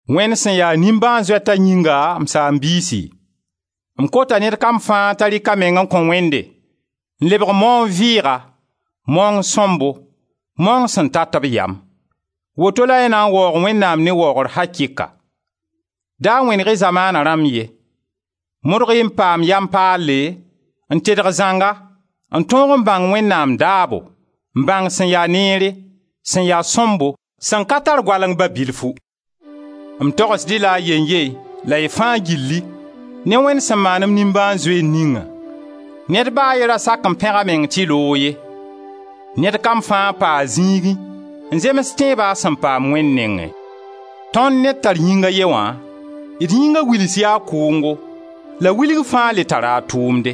Wẽnd sẽn ya nimbãan-zoeta yĩnga, m saam-biisi, m kota ned kam fãa t'a rɩka meng n kõ Wẽnde n lebg maoong vɩɩga, maoong sõmbo, maoong sẽn tat b yam: woto la y na n waoog Wẽnnaam ne waoogr akɩka. Da wẽneg-y zamaana rãmb ye; modg-y n paam yam paale n tedg zãnga n tõog n bãng Wẽnnaam daabo, n bãng sẽn ya neere, sẽn ya sõmbo, sẽn ka tar goaleng ba bilfu. M togsd-y la a yeyn-ye la y fãa gilli, ne Wẽnd sẽn maan-m nimbãan-zoeer ningã: ned ba a ye ra sak n pẽga meng tɩ loog ye. Ned kam fãa pa a zĩigẽ n zems tẽebã a sẽn paam Wẽnd nengẽ. Tõnd ne d tar yĩng a ye wã, d yĩnga wils yaa kʋʋngo, la wilg fãa le tara a tʋʋmde.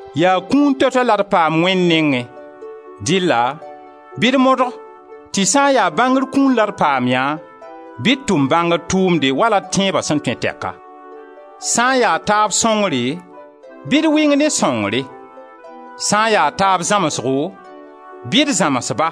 Yaa kũun toɛ-toɛ la d paam Wẽnd nengẽ, dɩlla bɩ d modg tɩ sã n ya bãngr kũun la d paam yã bɩ d tʋm bãngr tʋʋmde wala d tẽeba sẽn tõe tɛka. Sã n ya taab sõngre, bɩ d wɩng ne sõngre; sã n ya taab zãmsgo, bɩ d zãms-ba;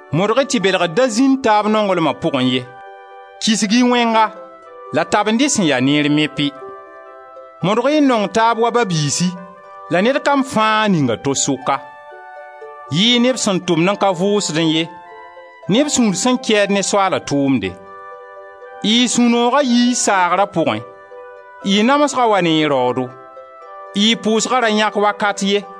Modg-y tɩ belgr da zĩnd taab nonglma pʋgẽ ye, kisg-y wẽnga la tabend-y sẽn ya neer mepi! Modg-y n nong taab wa ba-biisi la ned kam fãa ning a to sʋka. Yɩ-y neb sẽn tʋmd n ka vʋʋsdẽ ye, neb sũur sẽn kɛɛd ne Soaala tũumde. Y sũ-nooga yi y saagra pʋgẽ, y namsga wa ne y raoodo; y pʋʋsga ra yãk wakat ye,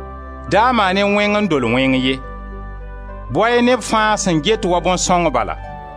Da maan-y wẽng n dol wẽng ye; bao-y neb fãa sẽn get wa bõn-sõng bala.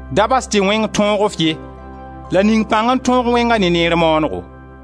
Da bas tɩ wẽng tõog-f ye, la ning pãng n tõog wẽnga ne neer maanego.